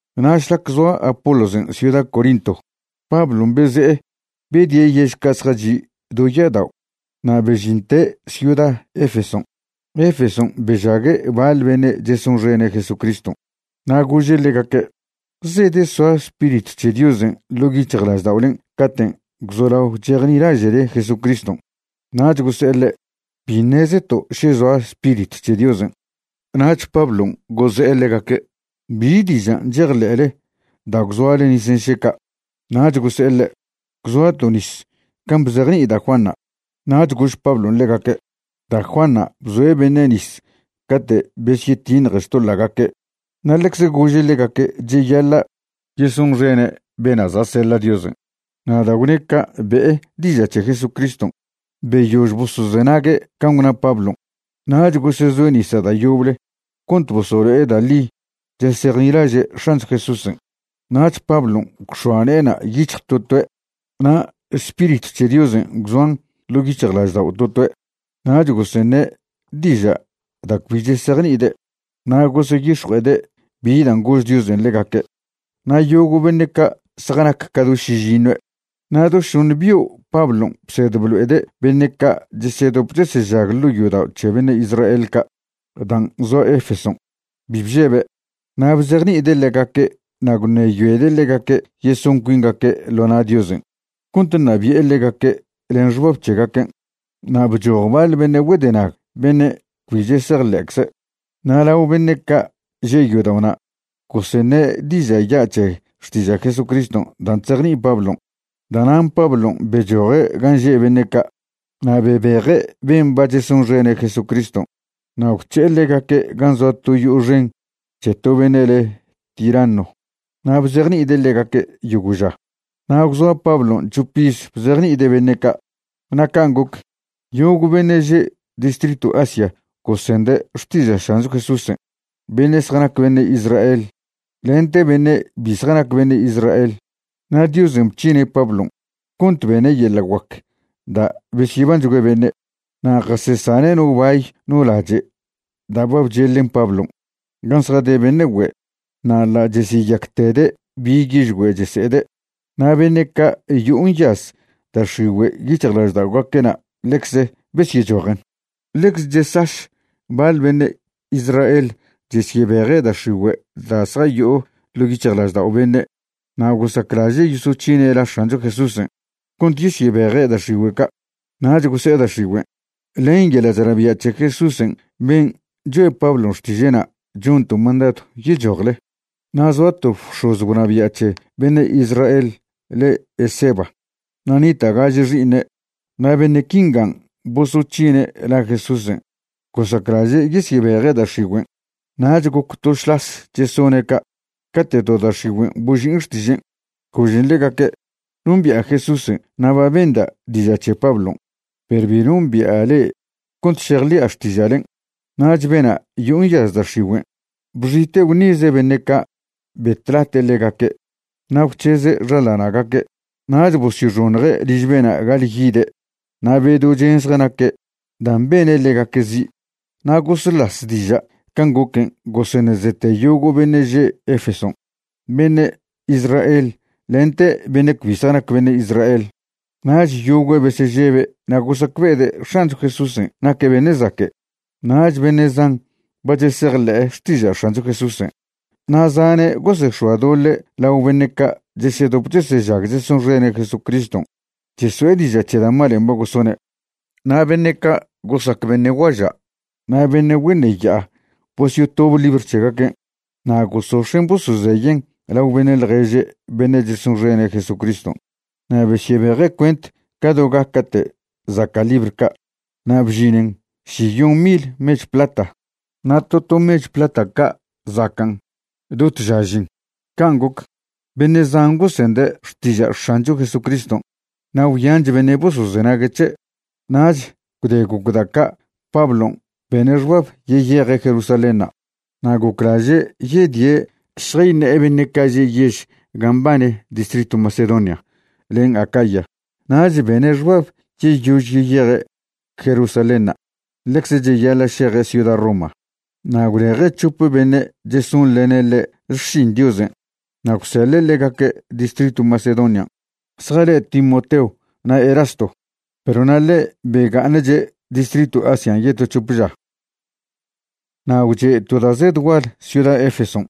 Na' šlac zoa Apolosen' ciuda Corinto, Pablon' beze'e bedie' yež ca' zjachi' do ya'adao' na' bežinte' ciuda Efeson'. Efeson' bežague' baḻ beṉe' chesonxene' Jesucriston'. Na' gože' ḻegaque': ―¿Zedesoa Spiritw c̱he Diosen' ḻo' yic̱hjlažda'olen' caten' gwzolao chejnilaže'le Jesucriston'? Nach gose'e ḻe': ―Bi ṉezeto' še zoa Spiritw c̱he Diosen'. Nach Pablon' goze'e ḻegaque': ―¿Bi dižan' chejḻe'le da' gwzoale nisen' še ca'? Nach gose'e ḻe': ―Gwzoato' nis can' bzejni'i da' Juanṉa'. Nach gož Pablon' ḻegaque': ―Da' Juanṉa' bzoe' beṉe' nis cate' besyetiṉje xtoḻa'gaque' na' ḻecze gože' ḻegaque' cheyaḻa' yesonxene' bena' za' seḻa' Diosen'. Na' da' gwne' ca' be'e diža' c̱he Jesucriston'. Beyož bosozenague' can' gwna Pablon' nach gosezoe' nisa' da' yoble cont bosolo'e da' ḻi chesejnilaže' X̱ancho Jesúsen'. Nach Pablon' gwx̱oa ne'ena' yic̱hj to toe' na' Spiritw c̱he Diosen' gwzoan ḻo' yic̱hjlaždao' to toe', nach goseṉe' diža' da' cbi chesejni'ide' na' goseyix̱jue'ede' bi dan' gož Diosen' ḻegaque'. Na' yogo' beṉe' ca' zjanac ca do šižiṉue'. Na' do šoṉe bio' Pablon' bsed blo'ede' beṉe' ca' chesedop chesežag ḻo' yodao' c̱he beṉe' Israel ca' dan' zoa Efeson'. Bi bžebe', na' bzejni'ide' ḻegaque' na' gwṉeyoede' ḻegaque' yeson cuingaque' ḻo na' Diosen' cont ṉabi'e ḻegaque' len xbab c̱hegaquen'. Na' bchoj baḻ beṉe' güedenag beṉe' cbi chesejḻe'cze', na' lao beṉe' ca' že' yodao'na' goseṉe' diža' ya' c̱he xtiža' Jesucriston' dan' chzejni'i Pablon'. Da'nan' Pablon' bechoje' gan' že' beṉe' ca' na' bebeje' ben' ba chesonxene' Jesúcriston' na' gwc̱he'e ḻegaque' gan' zoa to yo'o xen c̱he to beṉe' le' Tiranno na' bzejni'ide' ḻegaque' yogo' ža. Na' gwzoa Pablon' c̱hop iz bzejni'ide' beṉe' ca', na' can' goc, yogo' beṉe' že' distritw Asia gosende' xtiža' X̱ancho Jesúsen', beṉe' zjanac beṉe' Israel lente beṉe' bi zjanac beṉe' Israel. Na' Diosen' bc̱hine' Pablon' cont bene' yeḻa' guac da' besyebanchgüe beṉe'. Na' jasesane' no bay no lache' da' ba bcheḻen Pablon' gan' zjade beṉe' güe' na' ḻa' chesyeyactede' bi yižgüe' chese'ede', na' beṉe' ca' yo'o nyaz da' x̱igüe' yic̱hjlažda'ogaque'na' ḻecze besyechojen. Ḻecze chesaš baḻ beṉe' Israel chesyebeje' da' x̱igüe' da' zjayo'o ḻo' yic̱hjlaždao' beṉe' na' gosaclaže' yosoc̱hine' la X̱ancho Jesúsen' cont yesyebeje' da' x̱igüe' ca', nach gose'e da' x̱igüen': ―Len yeḻa' chnabia' c̱he Jesúsen' ben' choe' Pablon' xtiže'na' chonto' mandadw yechojle. Na' zoa to bx̱oz gwnabia' c̱he beṉe' Israel le' Esceva, na' nita' gaže xi'iṉe'. Na' beṉe' quingan' bosoc̱hine' la Jesúsen' gosaclaže' yesyebeje' da' x̱igüen'. Nach goc to šlas chesone' ca' cate' to da' x̱igüen' boži'in xtižen', gožen ḻegaque': ―Nombi'a Jesúsen' na' ba benda' diža' c̱he Pablon', perw bi nombi'a le'e cont šejḻi'a xtiža'len'. Nach bena' yo'o nyaz da' x̱igüen' bxite' gwṉize' beṉe' ca' betlate' ḻegaque' na' gwc̱heze' xaḻana'gaque'. Nach bosyoxoṉje' liž bena' ga'aḻyide' na' bedo chen zjanaque' dan' bene' ḻegaque' zi'. Na' goslas diža' can' goquen' goseṉezete yogo' beṉe' že' Efeson', beṉe' Israel lente beṉe' cbi zjanac beṉe' Israel. Nach yogüe' besežebe' na' gosacbe'ede' X̱ancho Jesúsen' naque' beṉe' zaque'. Nach beṉe' zan ba chesejḻe'e xtiža' X̱ancho Jesúsen', na' zane' gosex̱oadoḻe' lao beṉe' ca' chesedop chesežag chesonxene' Jesucriston' cheso'e diža' c̱he da' malen' ba gosone'. Na' beṉe' ca' gosac beṉe' guaža' na' beṉe' güeṉe ya'a bosyotob libr c̱hegaquen' na' gosox̱en' bosozeyen' lao beṉe' ḻježe' beṉe' chesonxene' Jesucriston'. Na' besyebeje' cuent ca do gaca'te' zaca' libr ca' na' bžinen šiyon mil mechw plata, na' to to mechw plata ca' zacan' do tža žin. Can' goc, beṉe' zan gosende' xtiža' X̱ancho Jesucriston', na' gwyanch beṉe' bosozenague' c̱he'. Nach gwde goc da' ca' Pablon' bene' xbab yeyeje' Jerusalénṉa', na' goclaže' yedie' šjayṉe'e beṉe' ca' že' yež gan' mbane distritw Macedonia len Acaya. Nach bene' xbab yeyož yeyeje' Jerusalénṉa' ḻecze cheyaḻa' šeje' ciuda Roma. Na' gwleje' c̱hope beṉe' chesonḻene' ḻe' xšin Diosen' na' gwseḻe' ḻegaque' distritw Macedonian', zjale' Timoteo na' Erasto, perw na' ḻe' bega'aṉche' distritw Asian' yeto c̱hope ža. Na' gwche' to da' zed gual ciuda Efeson',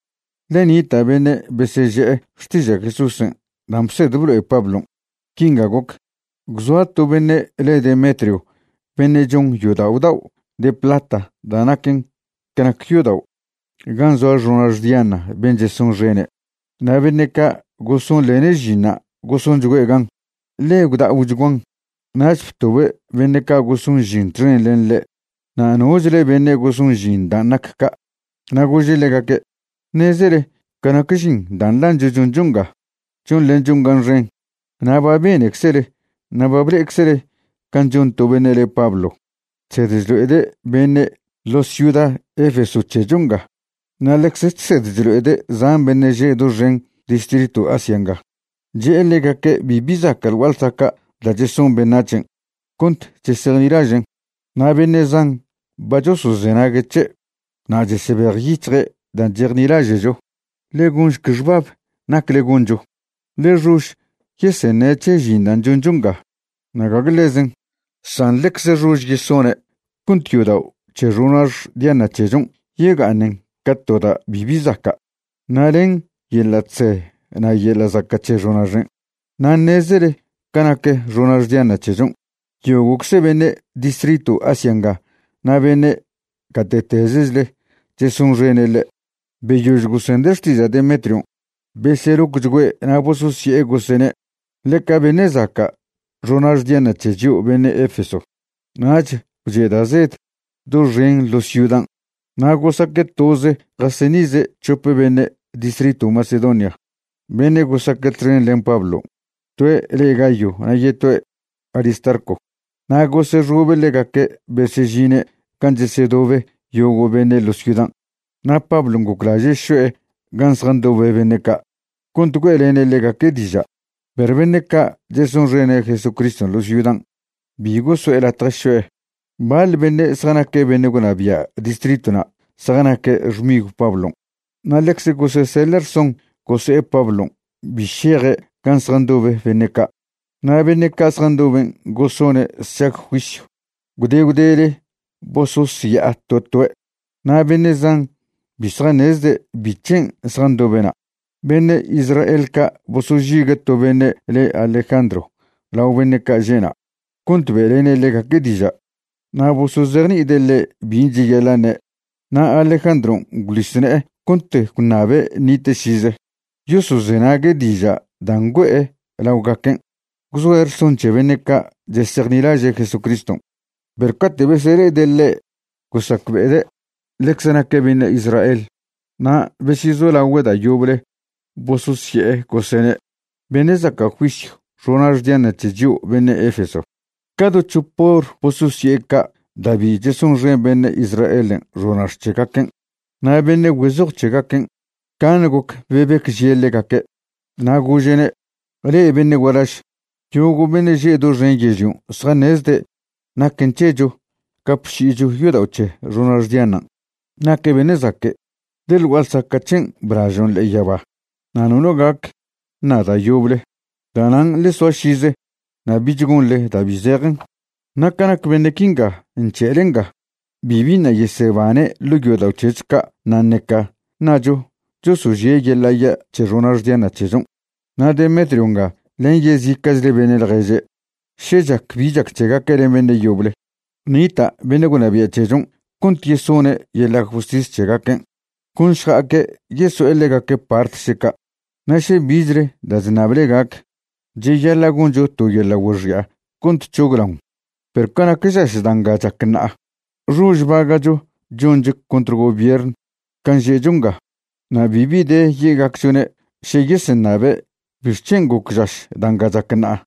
ḻe nita' beṉe' beseže'e xtiža' Jesúsen' dan' bsed blo'e Pablon'. Quinga goc: gwzoa to beṉe' le' Demetrio beṉe' chon yodao' dao' de plata da' naquen ca nac yodao' gan' zoa xonax Diana ben' chesonxene'. Na' beṉe' ca' gosonḻene' žinṉa' gosonchgüe' gan, ḻe gwda'ochguan. Nach btobe' beṉe' ca' goson žin txen len ḻe' na' nochle beṉe' goson žin dan' nac ca', na' gože' ḻegaque': ―Ṉezele ca nac žin dan' nḻancho choncho nga, chonḻenchon gan xen. Na' ba beneczele na' ba ble'eczele can' chon to beṉe' le Pablo chsed chlo'ede' beṉe' ḻo ciuda Efeso c̱hecho nga na' ḻecze chsed chlo'ede' zan beṉe' že' doxen distritw Asia nga, che'e ḻegaque' bibi zaca' ḻ gua'a ḻsaca' da' cheson beṉac̱hen' cont chesejnilažen'. Na' beṉe' zan ba chosozenague' c̱he' na' chesebejyic̱hje' dan' chejnilaže'cho. Ḻe gonšc xbab nacle goncho, ḻe xož yeseṉe' c̱he žin dan' choncho nga, na' gague ḻezen, san ḻecz xož yesone' cont yodao' c̱he xonax Diana c̱hechon' yega'aṉen ca to da' bibi zaca' na' len yeḻa' chze na' yeḻa' zaca' c̱he xonaxen'. Na' ṉezele ca nac xonax Diana c̱hechon', yogo'cze beṉe' distritw Asia nga na' beṉe' gate'tezechle chesonxene' ḻe'. Beyož gosende' xtiža' Demetrion' beselocchgüe' na' bososye'e gosene': ―Ḻeca beṉe' zaca' xonax Diana c̱he chio' beṉe' Efeso. Nach gwche' da' zed doxen ḻo ciudan', na' gosaque' toze' jaseṉize' c̱hope beṉe' distritw Macedonia beṉe' gosaque' txen len Pablon', toe' le Gayo na' yetoe' Aristarco. Na' gosexobe' ḻegaque' besežine' gan' chesedobe yogo' beṉe' ḻo ciudan'. Na' Pablon' goclaže' šo'e gan' zjandobe beṉe' ca' cont güe'lene' ḻegaque' diža', perw beṉe' ca' chesonxene' Jesucriston' ḻo ciudan' bi goso'e latje šo'e. Baḻ beṉe' zjanaque' beṉe' gwnabia' distritwna' zjanac xmigw Pablon' na' ḻecze goseseḻe' rson gose'e Pablon' bi šeje' gan' zjandobe beṉe' ca'. Na' beṉe' ca' zjandoben' gosone' sšag juisyw. Gwde gwdele bososya'a to toe'. Na' beṉe' zan bi zjaṉezde' bic̱hen' zjandobe'na'. Beṉe' Israel ca' bosožigue' to beṉe' le Alejandro lao beṉe' ca' že'na' cont be'lene' ḻegaque' diža', na' bosozejni'ide' ḻe' bin' cheyaḻa' ṉe'. Na' Alejandron' gwḻis ne'e cont gwṉabe' nite' šize yosozenague' diža' dan' güe'e laogaquen' gwzoe' rson c̱he beṉe' ca' chesejnilaže' Jesucriston'. Perw cate' besele'ede' ḻe' gosacbe'ede' ḻecze naque' beṉe' Israel, na' besyezolagüe' da' yoble bososye'e, gosene': ―Beṉe' zaca' juisyw xonax Diana c̱he chio' beṉe' Efeso. Ca do c̱hop hor bososye'e ca' da' bi chesonxen beṉe' Israelen' xonax c̱hegaquen'. Na' beṉe' güezoj c̱hegaquen' caṉe goc bebecžie' ḻegaque'. Na' gože'ne': ―Le'e beṉe' gualaž, yogo' beṉe' že' doxen yežlion' zjaṉezde' naquen c̱hecho gapši'icho yodao' c̱he xonax Dianan'. Naque' beṉe' zaque', ḻe ḻ gua'a ḻsaca' c̱hen' blažon' ḻe'e yaba. Na' nono gac ṉa da' yoble. Da'nan' ḻe soa šize na' bich gonḻe da' bi zejen. Na' ca nac beṉe' quinga nc̱he'ele nga, bibi ṉa' yesebane' ḻo' yodao' c̱hecho ca' na' ṉeca ṉacho chosožie' yeḻa' ya' c̱he xonax Diana c̱hechon'. Na' Demetrio nga len yezica'chle beṉe' ḻježe', še chac bi chac c̱hegaque' len beṉe' yoble, nita' beṉe' gwnabia' c̱hechon' cont yesone' yeḻa' justis c̱hegaquen', con šja'aque' yeso'e ḻegaque' part še ca'. Na' še bichle da' chṉable gac, cheyaḻa' goncho to yeḻa' güexi'a cont c̱hoglaon. Perw ca nac žaš da' nga chac ṉa'a, xož baga'cho choncho contr gobiern can' že'cho nga, na' bibi de ye'gacchone' še yeseṉabe' bixc̱hen' goc žaš da' nga chac ṉa'a.